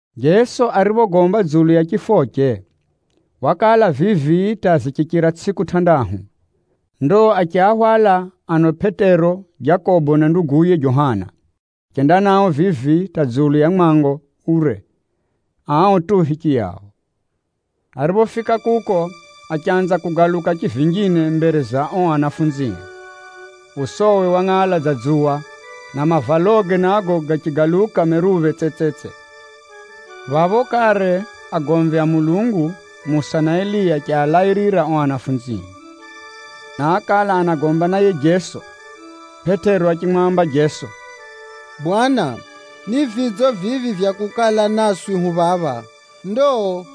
Jeso ariphogomba dzulu ya chifoche, wakala vivi hata zichichira tsʼiku tʼandahu, ndo achiahwala ano Pʼetero, Jakobo na nduguye Johana, achenda nao vivi hata dzulu ya mwango ure ao tu hichiyao. Ariphofika kuko, achanza kugaluka chivinjine mbere za ao anafunzie. Usowe wangʼala dza dzuwa, na mavaloge nago gachigaluka meruphe tsetsetse. Phapho kare agomvi a Mulungu, Musa na Eliya achialairira ao anafunzie, na ákala anagomba na yiye Jeso. Pʼetero achimwamba Jeso, “Bwana, ni vidzo vivi vya kukala naswi hu phamwenga phapha! Ndo,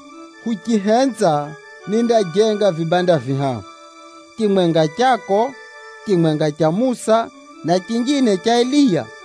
uchihenza, nindajenga vibanda vihahu: chimwenga chako, chimwenga cha Musa na chinjine cha Eliya.”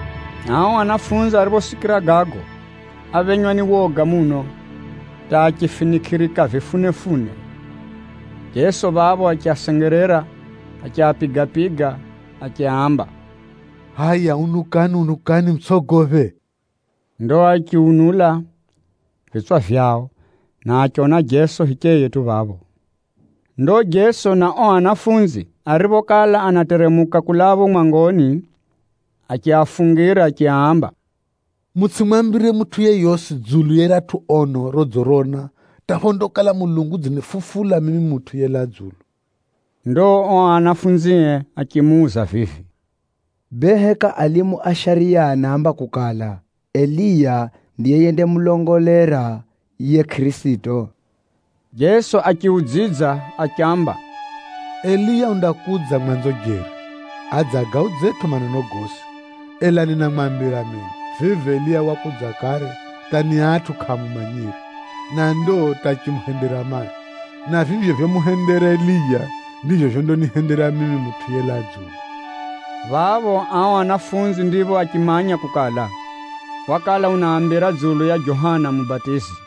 Ao anafunzi ariphosikira gago, áphenywa ni woga muno hata achifinikʼirika vifunefune. Jeso phapho achiasengerera, achiapiga-piga achiaamba, “Hʼaya unukani mutsʼogophe!” Ndo achiunula vitswa vyao, na achiona Jeso hicheye tu phapho. Ndo Jeso na ao anafunzi ariphokala anateremuka kulaa phapho mwangoni, achiafungira achiaamba, “Mutsʼimwambire mutʼu yeyosi dzulu ya riratʼu ono rodzirona hata phondakala Mulungu udzinifufula mimi Mutʼu yelaa dzulu.” Ndo ao anafunzie achimuuza vivi, “Bee heka alimu a shariya anaamba kukala, Eliya ndiye yendamulongolera yiye Kʼirisito?” Jeso achiudzidza achiamba, “Eliya undakudza mwanzo jeri, adze agaudzetʼo maneno gosi. Ela ninamwambira mino, vivi Eliya wakudza kare hata ni atʼu kʼaamumanyire, na ndo hata achimuhendera mai. Na vivyo vyomuhendera Eliya, ndivyo vyondanihendera mimi Mutʼu yelaa dzulu.” Phapho ao anafunzi ndipho achimanya kukala, wakala unaambira dzulu ya Johana Mubatizi.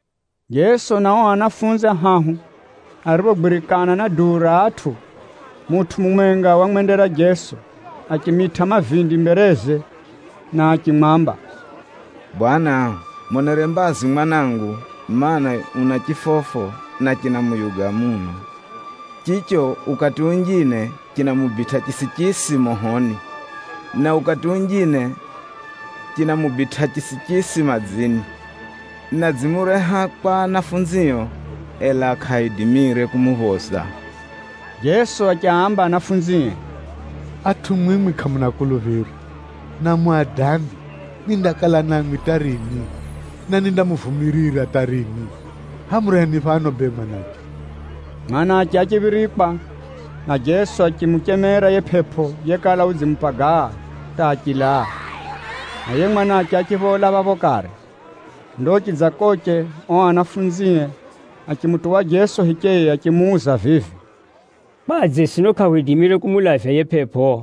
Jeso na ao anafunzi ahahu ariphogwirikana na duu ra atʼu, mutʼu mumwenga wamwendera Jeso, achimitʼa mavindi mbereze na achimwamba, “Bwana, monere mbazi mwanangu, mana, una chifofo na chinamuyuga muno. Chicho ukati unjine chinamubitʼa chisichisi mohoni, na ukati unjine chinamubitʼa chisichisi madzini. Na nidzimureha kwa ahumwao, ela kʼaaidimire kumuphoza.” Jeso achiaamba ahumwae, “Atʼu mwimwi kʼamuna kuluphiro, na muna adambi! Nindakala Na mwimwi hata rini? Na nindamuvumirira hata rini? Hʼaya mureheni phano bee yiye mwanache!” Mwanache achiphirikwa, na Jeso achimuchemera yiye pʼepʼo yekala udzimupagaa hata achilaa, na yiye mwanache achiphola phapho kare. Ndo chidzakoche, ao anafunzie achimutuwa Jeso hicheye achimuuza vivi, “Kwadze sino kʼahwidimire kumulavya yiye pʼepʼo?”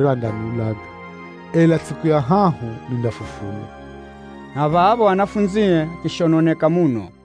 andaniulaga, ela tsʼiku ya hahu nindafufulwa.” Na phapho ahumwae achishononeka muno.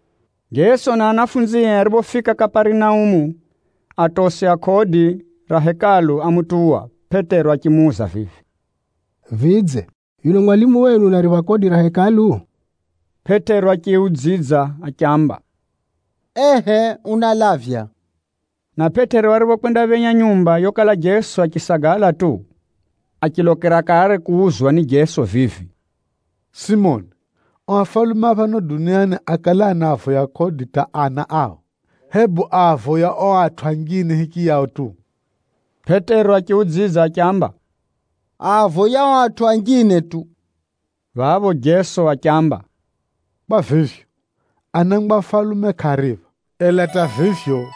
Jeso na ahumwae ariphofika Kaparinaumu, atosi a kodi ra Hekalu ámutuwa Pʼetero achimuuza vivi, “Vidze, yuno mwalimu wenu unaripha kodi ra Hekalu?” Pʼetero achiudzidza achiamba, “Ehʼe, unalavya.” Na Pʼetero ariphokwendaphenya nyumba yokala Jeso achisagala tu, achilokera kare kuuzwa ni Jeso vivi, “Simoni, ano afalume a phano duniani akale anavoya kodi hata ana ao, hebu aavoya ao atʼu anjine hichiyao tu?” Pʼetero achiudzidza achiamba, “Aavoya ao atʼu anjine tu.” Phapho Jeso achiamba, “Kwa vivyo, anangwa a afalume kʼaaripha. Ela hata vivyo,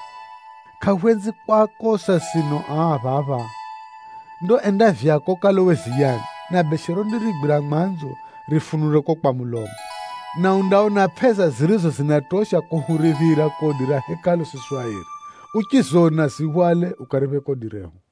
kʼahwenzi kwakosa sino ao a phapha. Ndo enda vyako ukalowe ziyani, na beshe rondarigwira mwanzo rifunule kuko kwa mulomo, na undaona pʼesa zirizo zinatosha kuhuriphira kodi ra Hekalu siswi airi. Uchizona, zihwale ukariphe kodi rehu.”